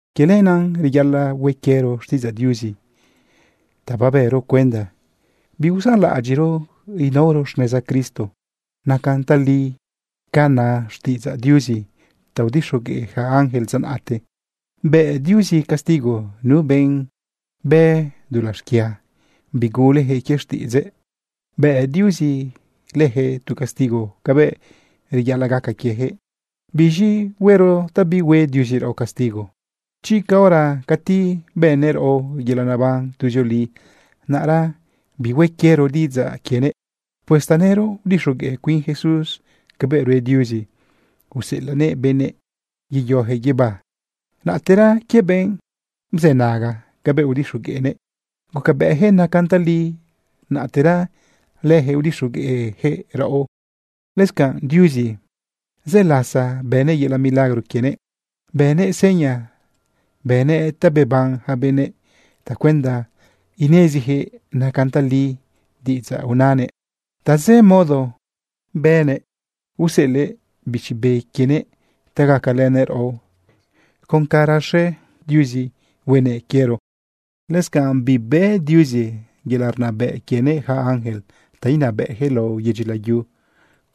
Quie lenaꞌ reyaꞌalaꞌ hue quiero xtiꞌidzaꞌ Diuzi ta babero cuenda biusanlaꞌadyiꞌro inaoro xneza Cristo. Nacan tali ca na xtiꞌidzaꞌ Diuzi ta udixogueꞌ yaca ángel dza naꞌte. Bë Diuzi castigo nu benꞌ bë dulaꞌ xquia bigulejëꞌ quie xtiꞌidzëꞌ. Bë Diuzi lëjëꞌ tu castigo cabëꞌ reyaꞌalaꞌ gaca quiejëꞌ. ¿Biz̃i huero ta bihue Diuzi raꞌo castigo chi caora cati bënnëꞌ raꞌo yelaꞌ neban tuzioli, naꞌra bihue quiero diꞌidzaꞌ quienëꞌ? Pues tanëro udixogueꞌ cuin Jesús cabëꞌ rue Diuzi uselanëꞌ benëꞌ yeyojëꞌ guibá. Naꞌtera quie benꞌ bzënaga cabëꞌ udixogueꞌnëꞌ, gucabëꞌyaquëꞌ nacan tali, naꞌtera lëjëꞌ udixogueꞌjëꞌ raꞌo. Lëscanꞌ Diuzi, zë lasa bënëꞌ yelaꞌ milagro quienëꞌ, bënëꞌ seña, bënëꞌ ta beban ja benëꞌ tacuenda ineziyaquëꞌ nacan tali diꞌidzaꞌ unanëꞌ. Tazë modo bënëꞌ useꞌelëꞌ Bichi Be quienëꞌ ta gacalënëꞌ raꞌo con ca raxe Diuzi huenëꞌ quiero. Lëscanꞌ bibëꞌ Diuzi yelaꞌ rnabëꞌ quienëꞌ yaca ángel ta inabëꞌjëꞌ lao yedyi layu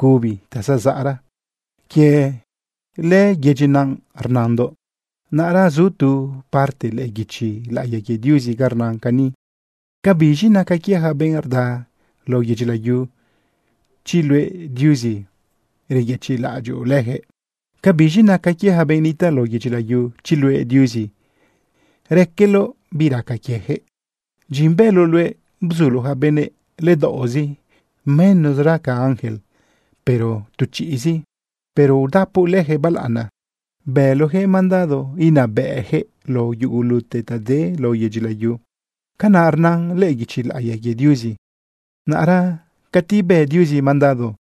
cubi ta zazaꞌra. Quie lëyedyi naꞌ rnandoꞌ. Naꞌra zu tu parte lëꞌë guichi laꞌiya quie Diuzi ga rnan cani: ¿Cabiz̃i naca quie yaca benꞌ rda lao yedyi layu, chi luëꞌ Diuzi, reyëchiꞌlaꞌadyoꞌ leyaquëꞌ? ¿Cabiz̃i naca quie yaca benꞌ nitaꞌ lao yedyi layu, chi luëꞌ Diuzi, raqueloꞌ bi raca quieyaquëꞌ? Dyin bëloꞌ luëꞌ bzuloꞌ ja benëꞌ ledaoꞌzi menosra ca ja ángel, pero tu chiꞌzi. Pero udapoꞌ lëjëꞌ balaꞌana. Bëloꞌjëꞌ mandado inabëꞌjëꞌ lao yugulute ta de lao yedyi layu. Canaꞌ rnan lëꞌë guichi laꞌiya quie Diuzi. Naꞌra cati bë Diuzi mandado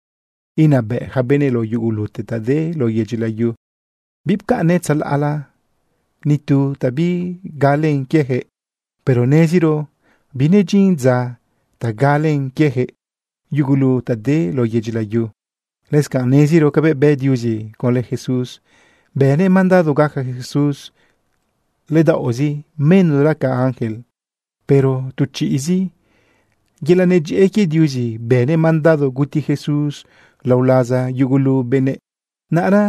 inabëꞌ ja benëꞌ lao yugulute ta de lao yedyi layu, bipcaꞌnnëꞌ tzalaꞌla ni tu ta bigalen quiejëꞌ. Pero neziro binedyin dza ta galen quiejëꞌ yugulu ta de lao yedyi layu. Lëscanꞌ neziro cabëꞌ bë Diuzi conlë Jesús. Bënëꞌ mandado gaca Jesús ledaoꞌzi menosra ca yaca ángel, pero tu chiꞌzi. Yelaꞌ nedyëꞌë quie Diuzi bënëꞌ mandado guti Jesús lao laza yugulu benëꞌ. Naꞌra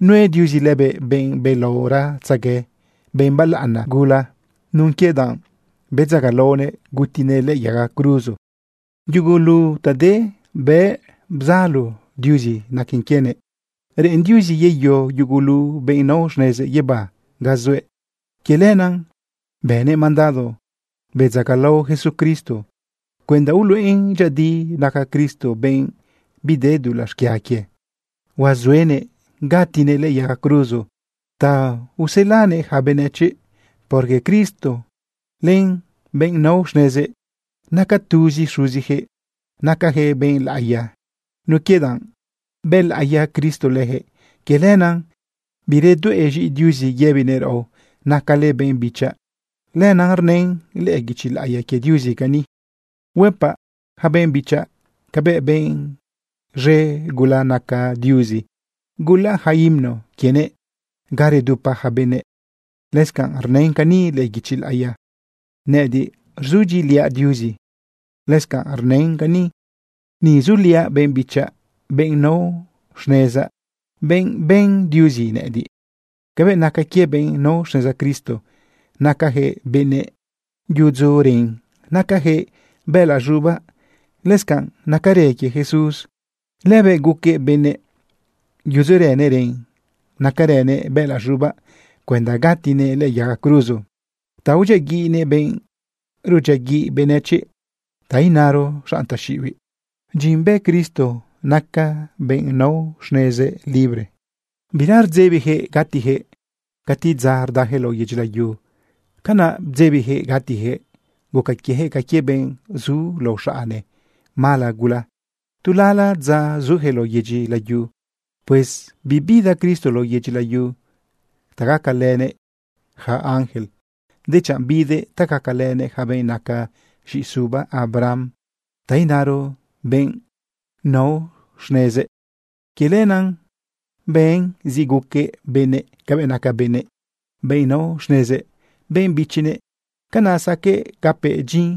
nue Diuzi lëbëꞌ benꞌ belaoratzegue, benꞌ balaꞌana gula nun quie danꞌ bedzagalaonëꞌ gutinëꞌ lëꞌë yaga cruzo. Yugulu ta de bë bzalo Diuzi naque quienëꞌ. Reꞌen Diuzi yeyo yugulu benꞌ nao xnezëꞌ guibá ga zuëꞌ. Quie lenaꞌ bënëꞌ mandado bedzagalao Jesucristo cuenda uluꞌen dyëꞌëdi naca Cristo benꞌ bide dulaꞌ xquia quie, huazuenëꞌ gatinëꞌ lëꞌë yaga cruzo ta uselanëꞌ yaca benëchiꞌ. Porque Cristo len benꞌ nao xnezëꞌ, naca tuzi Xuzijëꞌ. Nacajëꞌ benꞌ laꞌiya nun quie danꞌ bëlaꞌiya Cristo lëjëꞌ. Quie lenaꞌ biredueꞌ z̃iꞌi Diuzi yëbinëꞌ raꞌo: “Nacale benꞌ bichaꞌ.” Lenaꞌ rnën lëꞌë guichi laꞌiya quie Diuzi cani: Huëpaꞌ ja benꞌ bichaꞌ cabëꞌ benꞌ z̃e gula naca Diuzi. Gulaꞌ ja himno quienëꞌ ga redupa ja benëꞌ. Lëscanꞌ rnën cani lëꞌë guichi laꞌiya: Nëꞌëdiꞌ rzudyiꞌiliaꞌ Diuzi. Lëscanꞌ rnën cani: Ni zuliaꞌ benꞌ bichaꞌ, benꞌ nao xnezaꞌ, benꞌ ben Diuzi nëꞌëdiꞌ. Cabëꞌ naca quie benꞌ nao xneza Cristo, nacajëꞌ benëꞌ yudzujëꞌ ren nacajëꞌ bëꞌëlaꞌ z̃ubaꞌ, lëscanꞌ nacarë quie Jesús. Lëbëꞌ guquëꞌ benëꞌ, yudzurënëꞌ ren nacarënëꞌ bëꞌëlaꞌ z̃ubaꞌ cuenda gatinëꞌ lëꞌë yaga cruzo ta udyiaguiꞌnëꞌ benꞌ rudyiaguiꞌ benëchiꞌ, ta inaro, xanꞌ taxiꞌibiꞌ. Dyin bë Cristo naca benꞌ nao xnezëꞌ libre. Bira rdzebijëꞌ gatijëꞌ. Cati dza rdajëꞌ lao yedyi layu, canaꞌ bdzebijëꞌ gatijëꞌ, guca quiejëꞌ ca quie benꞌ zu lao xaꞌne mala gula tu lala dza zujëꞌ lao yedyi layu. Pues bibida Cristo lao yedyi layu ta gacalënëꞌ yaca ángel, dechanꞌ bidëꞌ ta gacalënëꞌ yaca benꞌ naca z̃iꞌisuba Abraham, ta inaro, benꞌ nao xnezëꞌ. Quie lenaꞌ ben zi guqueꞌ benëꞌ cabëꞌ naca benëꞌ, benꞌ nao xnezëꞌ, benꞌ bichinëꞌ. Canaꞌ saqueꞌ gapëꞌ dyin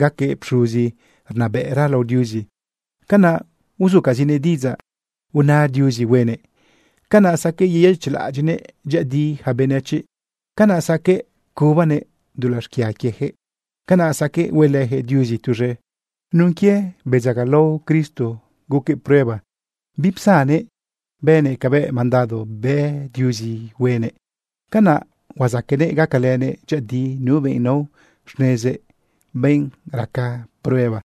gaquëꞌ pxuzi rnabëꞌra lao Diuzi. Canaꞌ uzucazinëꞌ diꞌidzaꞌ una Diuzi huenëꞌ. Canaꞌ saqueꞌ yeyëchiꞌlaꞌadyiꞌnëꞌ dyëꞌëdi yaca benëchiꞌ. Canaꞌ saqueꞌ cubanëꞌ dulaꞌ xquia quiejëꞌ. Canaꞌ saqueꞌ huelëjëꞌ Diuzi tuz̃e. Nun quie bedzagalao Cristo guquëꞌ prueba bipsannëꞌ bënëꞌ cabëꞌ mandado bë Diuzi huenëꞌ. Canaꞌ huazaqueꞌnëꞌ gacalënëꞌ dyëꞌëdi nu benꞌ nao xnezëꞌ, benꞌ raca prueba.